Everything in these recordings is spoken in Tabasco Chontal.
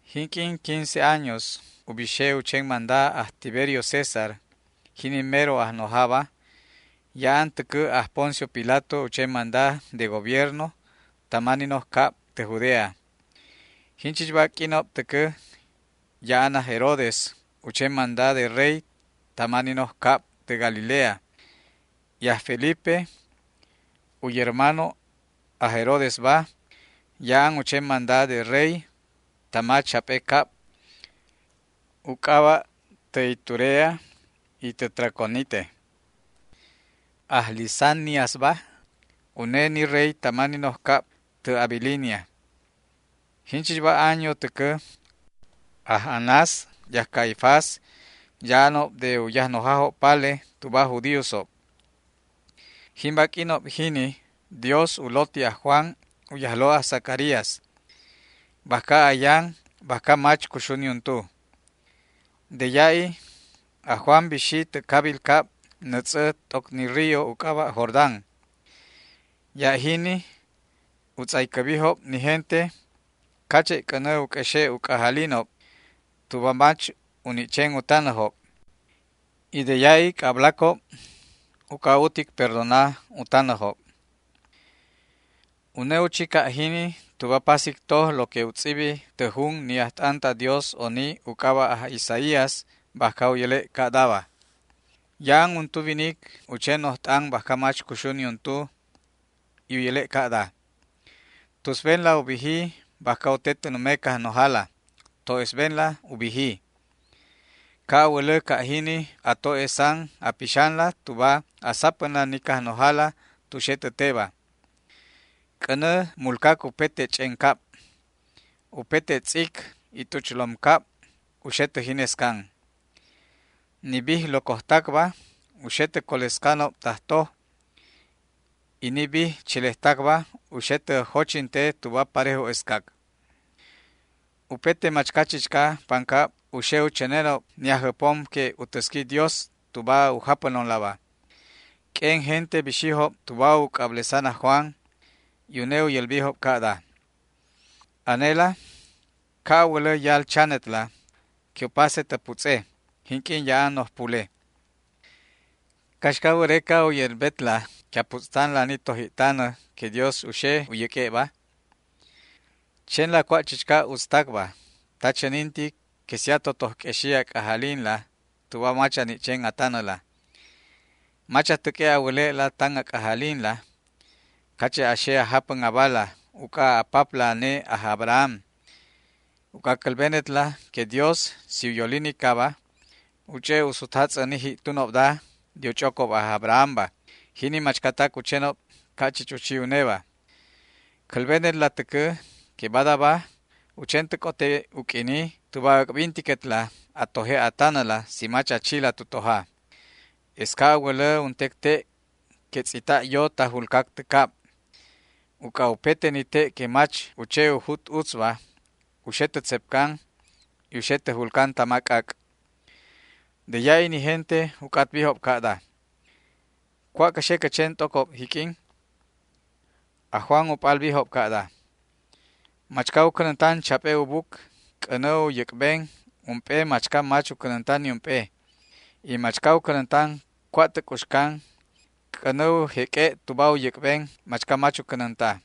Jinq'uin quince años u bixe u chen manda aj Tiberio César, jini mero ajnojaba, ya'an täcä aj Poncio Pilato u chen manda de gobierno tama ni noj cab tä Judea. Jinchichba q'uinob täcä ya'an aj Herodes u chen manda de rey tama ni noj cab tä Galilea, y aj Felipe, u yermano aj Herodesba, ya'an u chen manda de rey tama chap'e cab, u c'aba' tä Iturea y tä Traconite. Aj Lisaniasba, une ni rey tama ni noj cab tä Abilinia. Jinchichba año täcä aj Anás y aj Caifás ya'anob de u yajnojajob pale tuba aj judíosob. Jimba q'uinob jini Dios u loti aj Juan, u yajlo' aj Zacarías, bajca ayan bajca mach cuxu niuntu. De ya'i aj Juan bixi tä cabil cab nätz'ä t'oc ni río u c'aba' Jordán. Ya' jini u tz'aycäbijob ni gente cache' c'änä u q'uexe' u c'ajalinob tuba mach u ni' chen u tanäjob, y de ya'i c'ablacob uc'a utic perdona u tanäjob. Une u chi ca' jini tuba pasic toj lo que u tz'ibi tä jun ni ajt'an ta Dios oni u c'aba' aj Isaías bajca u yäle' ca'daba: Ya'an untu winic u chen noj t'an bajca mach cuxu niuntu y u yäle' ca'da: “Tusbenla u biji bajca u te tä nume Cajnojala, to'esbenla u biji. Ca' a wälä ca' jini a to'esan a pixanla tuba a sapänla ni Cajnojala tu xe tä teba. C'änä mulcac upete ch'en cab. Upete tz'ic y t'uchlom cab u xe tä jinescan. Ni bij locojtacba u xe tä colescanob tajtoj, y ni bij chelejtacba u xe tä jochinte tuba parejo'escac. Upete machca chichca pancab u xe u chänenob ni Ajjäpom que u täsqui Dios tuba u japänonlaba”. Q'uen gente bixijob tuba u c'ablesan aj Juan, y une u yälbijob ca'da: ―Anela ca' a wälä yal chanetla que u pase tä putz'e jinq'uin ya'an noj pule. ¿Caxca wäreca u yälbetla que a putz'tanla ni toji'tanä que Dios u xe u yäq'ue'ba? Chenla cua' chichca utztacba ta chänintic que si a totoj q'uexi a c'ajalinla tuba mach a ni' chen a tanäla. Mach a täq'ue' a wäle'la tan a c'ajalinla cache' a xe a japän abala uc'a a papla ane aj Abraham, uc'a cälbenetla que Dios, si u yolinicaba, u ch'e' u sutjatz'än ni ji'tunobda de u ch'ocob aj Abrahamba, jini machcatac u chenob ca' chich u chi uneba. Cälbenetla täcä que badaba u chen tä c'ote u q'uini tuba äc'bintiquetla a toje' a tanäla si mach a chila tu toja. Es ca' a wälä untec te' que tz'ita' yo ta julcac tä cab. Uc'a upete ni te' que mach u che u jut utzba u xe tä tzepcan y u xe tä julcan tama c'ac'. De ya'i ni gente u c'atbijob ca'da: ―¿Cua' cä xe cä chen t'ocob jiq'uin? Aj Juan u p'albijob ca'da: ―Machca u cänäntan chap'e u buc c'änä u yäc'ben ump'e machca mach u cänänta niump'e, y machca u cänäntan cua' tä c'uxcan c'änä u jeq'ue' tuba u yäc'ben machca mach u cänänta.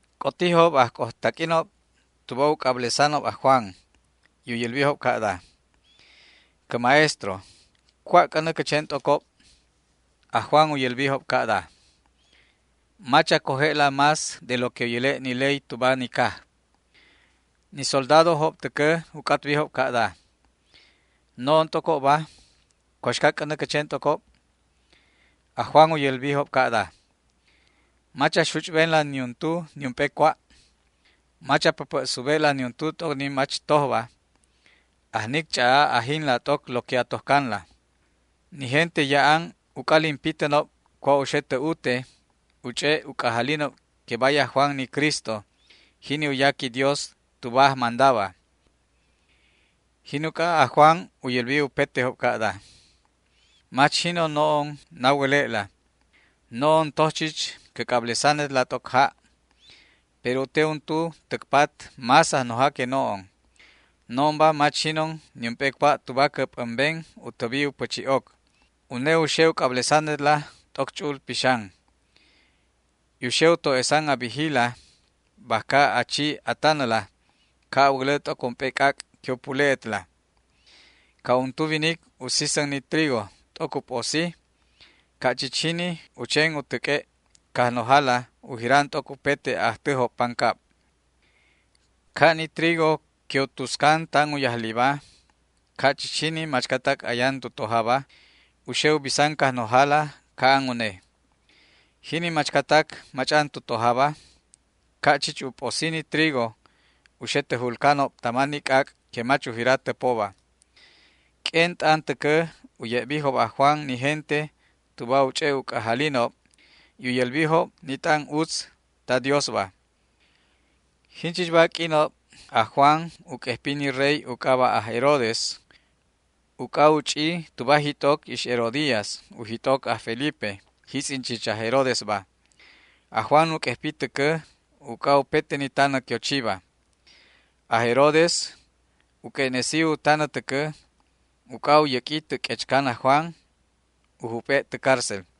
C'otijob ajcojtaq'uinob tuba u c'ablesanob aj Juan, y u yälbijob ca'da: ―Cä Maestro, ¿cua' c'änä cä chen t'ocob? Aj Juan u yälbijob ca'da: ―Mach a coje'la más de lo que u yäle' ni ley tuba ni caj. Ni soldadojob täcä u c'atbijob ca'da: ―No'on t'ocobba, ¿cuaxca c'änä cä chen t'ocob? Aj Juan u yälbijob ca'da: ―Mach a xuch'benla niuntu niump'e cua'. Mach a päpä' sube'la niuntu t'oc ni mach tojba. Ajnic ch'a'a ajinla t'oc lo que a tojcanla. Ni gente ya'an u c'alin pitänob cua' u xe tä ute y u ch'e' u c'ajalinob que bay aj Juan ni Cristo, jini u yaqui Dios tuba ajmandaba. Jin uc'a aj Juan u yälbi upetejob ca'da: ―Mach jinon no'on na wäle'la. No'on toj chich cä c'ablesanetla t'oc ja', pero u te untu täc pat más Ajnoja que no'on. No'onba mach jinon niump'e cua' tuba cä p'ämben u täbi u pächi'oc. Une u xe u c'ablesanetla t'oc Ch'u'ul Pixan, y u xe u to'esan a bijila bajca a chi a tanäla, ca' a wälä t'oc ump'e c'ac' que u pule'etla. Ca' untu winic u sisän ni trigo t'oc u p'osi, ca' chich jini u chen u täq'ue' Cajnojala u jiran t'oc upete a'ajtäjob pancab. Ca' ni trigo que u tuscan tan u yajliba, ca' chich jini machcatac ayan tu tojaba u xe u bisan Cajnojala ca'an une. Jini machcatac mach'an tu tojaba, ca' chich u p'osi ni trigo, u xe tä julcanob tama ni c'ac' que mach u jira täpoba. Q'uen t'an täcä u ye'bijob aj Juan ni gente tuba u ch'e' u c'ajalinob y u yälbijob ni t'an utz ta Diosba. Jinchichba q'uinob aj Juan u q'uejpi ni rey u c'aba' aj Herodes uc'a u ch'i tuba jit'oc ix Herodías u jit'oc aj Felipe, jitz'in chich aj Herodesba. Aj Juan u q'uejpi täcä uc'a upete ni tanä que u chiba. Aj Herodes u q'ue'nesi u tanä täcä uc'a u yäq'ui tä q'uechcan aj Juan u jup'e' tä cárcel.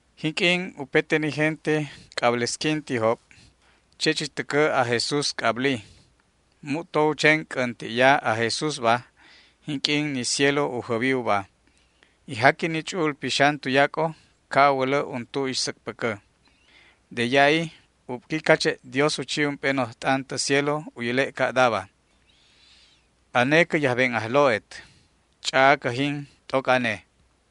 Jinq'uin upete ni gente c'ablesquintijob, che' chich täcä aj Jesús c'abli. Mu'to u chen c'änti'ya aj Jesúsba jinq'uin ni cielo u jäbi uba, y jaqui ni Ch'u'ul Pixan tuyac'o, ca' a wälä untu ixsäcpäcä. De ya'i ubqui cache' Dios u chi ump'e noj t'an tä cielo u yäle' ca'daba: ―Ane cä yajben Ajlo'et. Ch'a'a cäjin t'oc ane.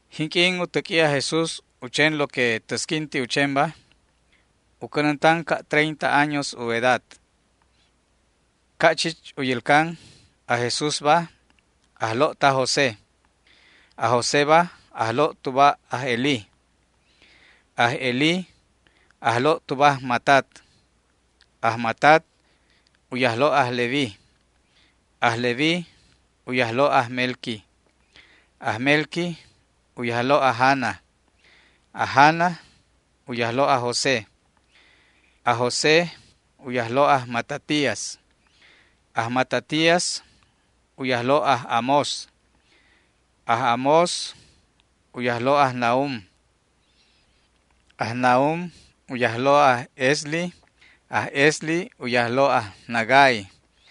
Jinq'uin u täq'ui aj Jesús u chen lo que täsquinti u chenba, u cänäntan ca' treinta años u edad. Ca' chich u yälcan, aj Jesúsba ajlo' taj José. Aj Joséba ajlo' tuba aj Elí, aj Elí ajlo' tuba aj Matat, aj Matat u yajlo' aj Leví, aj Leví u yajlo' aj Melqui, aj Melqui u yajlo' aj Jana, aj Jana u yajlo' aj José, aj José u yajlo' aj Matatías, aj Matatías u yajlo' aj Amós, aj Amós u yajlo' aj Nahum, aj Nahum u yajlo' aj Esli, aj Esli u yajlo' aj Nagai,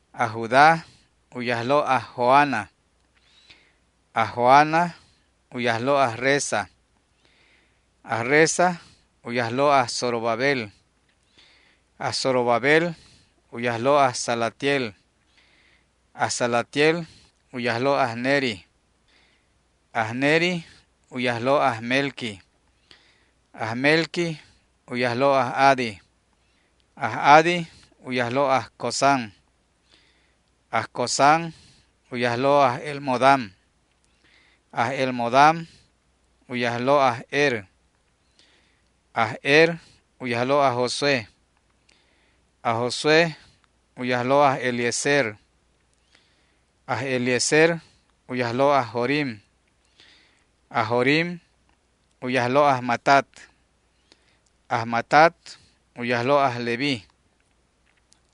aj Judá u yajlo' aj Joana, aj Joana u yajlo' aj Resa, aj Resa u yajlo' aj Zorobabel, aj Zorobabel u yajlo' aj Salatiel, aj Salatiel u yajlo' aj Neri, aj Neri u yajlo' aj Melqui, aj Melqui u yajlo' aj Adi, aj Adi u yajlo' aj Cosam, aj Cosam u yajlo' aj Elmodam, aj Elmodam u yajlo' aj Er, aj Er u yajlo' aj Josué, aj Josué u yajlo' aj Eliezer, aj Eliezer u yajlo' aj Jorim, aj Jorim u yajlo' aj Matat, aj Matat u yajlo' aj Leví,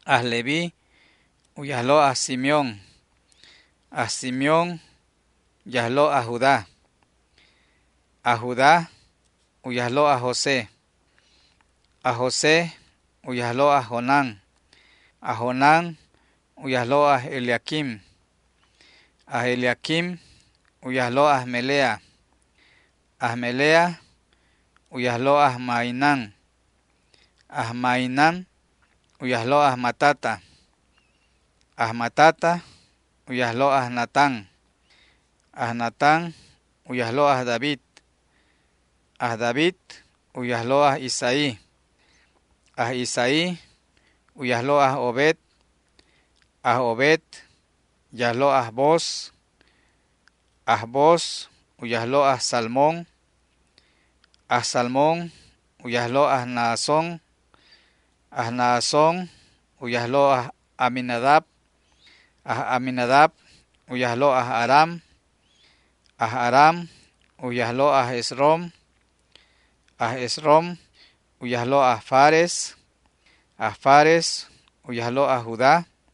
aj Leví u yajlo' aj Simeón, aj Simeón yajlo' aj Judá, aj Judá u yajlo' aj José, aj José u yajlo' aj Jonán, aj Jonán u yajlo' aj Eliaquim, aj Eliaquim u yajlo' aj Melea, aj Melea u yajlo' aj Mainán, aj Mainán u yajlo' aj Matata, aj Matata u yajlo' aj Natán, aj Natán u yajlo' aj David, aj David u yajlo' aj Isaí, aj Isaí u yajlo' aj Obed, aj Obed u yajlo' aj Booz, aj Booz u yajlo' aj Salmón, aj Salmón u yajlo' aj Naasón, aj Naasón u yajlo' aj Aminadab, aj Aminadab u yajlo' aj Aram, aj Aram u yajlo' aj Esrom, aj Esrom u yajlo' aj Fares, aj Fares u yajlo' aj Judá,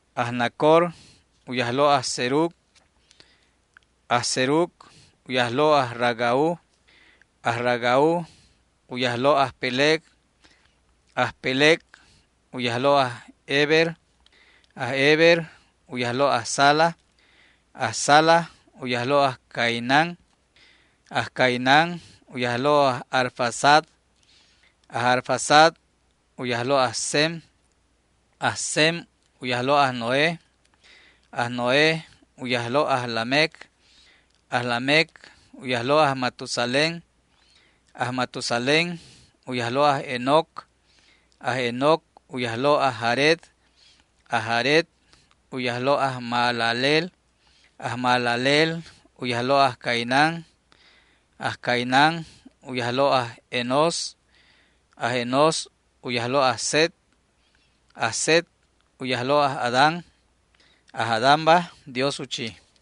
aj Nacor u yajlo' aj Serug, aj Serug u yajlo' aj Ragau, aj Ragau u yajlo' aj Peleg, aj Peleg u yajlo' aj Heber, aj Heber u yajlo' aj Sala, aj Sala u yajlo' aj Cainán, aj Cainán u yajlo' aj Arfaxad, aj Arfaxad u yajlo' aj Sem, aj Sem u yajlo' aj Noé, aj Noé u yajlo' aj Lamec, aj Lamec u yajlo' aj Matusalén, aj Matusalén u yajlo' aj Enoc, aj Enoc u yajlo' aj Jared, aj Jared u yajlo' aj Mahalaleel, aj Mahalaleel u yajlo' aj Cainán, aj Cainán u yajlo' aj Enós, aj Enós u yajlo' aj Set, aj Set u yajlo' aj Adán, aj Adánba Dios u chi.